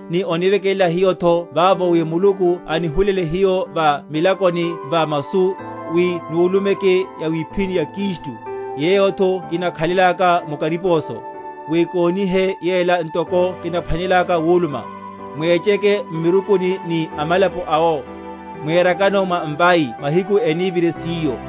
ni onivekelela hiyotho vavo, wi Muluku anihulele hiyo va milakoni va masu, wi nulumeke yawiphíni ya Kristu; yeyotho kinakhalelaka mu kariposo, wi konihe yela ntoko kinaphwanelelaka wuluma. Mwecheke m’mirukuni ni amalapo awo, mwerakano mwa mvai mahiku enívire siyo.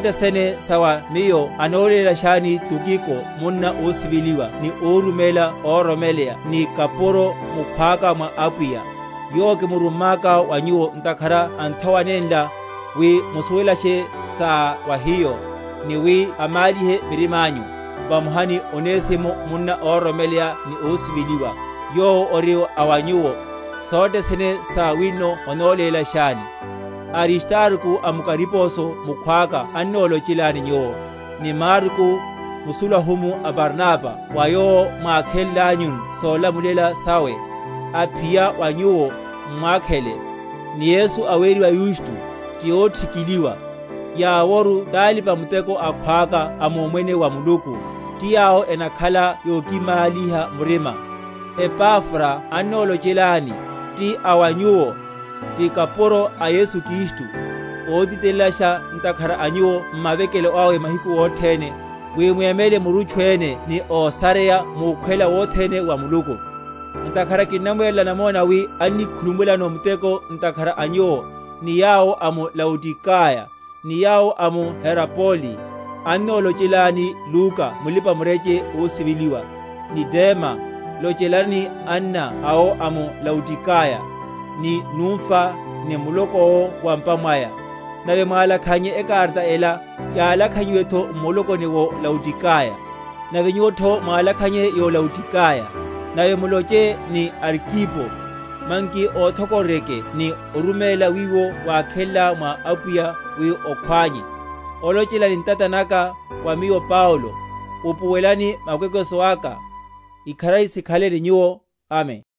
Sothe sene sa wa miyo anolélashani Tukiko, munna ósiveliwa ni óruméla óroromeleya ni kapuro mukhwaka mwa Apwiya: yowo kimurummaka wa nyuwo ntakhara a nthowa nenla, wi musuwelashe sa wa hiyo, ni wi amálihe mirimányu; vamoha ni Onesimo, munna óroromeleya ni ósiveliwa, yowo ori a wa nyuwo. Sothe sene sa wino enolélashani. Aristarko amukariposo mukhwaka annolochelani nyuwo, ni Marko, musulahumu a Barnaba (wa yowo mwákhenlanyu solamulela sawe; aphiya wa nyuwo, m’mwakhele), ni Yesu, aweriwa Yusto, ti óthikiliwa, yaworu talipa‐muteko akhwaka a mumwene wa Muluku, ti yawo enakhala yokimáliha murima. Epafra annolochelani, ti a wa nyuwo, ti kapuro a Yesu Kristu, ótitelelasha ntakhara a nyuwo m’mavekelo awe mahiku othene, wi mwemele murutchu ene ni ósareya mukhwela wothene wa Muluku. Ntakhara kinnamwerela namona wi annikhulumulano muteko ntakhara a nyuwo, ni yawo a mu Laodikaya, ni yawo a mu Herapoli. Annolochelani Luka mulipa‐mureche ósiveliwa, ni Dema. Lochelani anna awo a mu Laodikaya, ni Numfa, ni muloko’wo wa’mpa mwaya. Nave mwalakhannye ekarata ela, yalakhanyiwetho m’mulokoni wó Laodikaya, nave nyuwotho mwalakhanye yó Laodikaya. Nave muloche ni Arkipo, manki othokororyeke ni oruméla wiwo wákhenlá mwa Apwiya, wi okhwánye. Olochela ni ntata naka, wa miyo Paulo. Upuwelelani makwekweso aka. Ikharari sikhale ni nyuwo. Amen.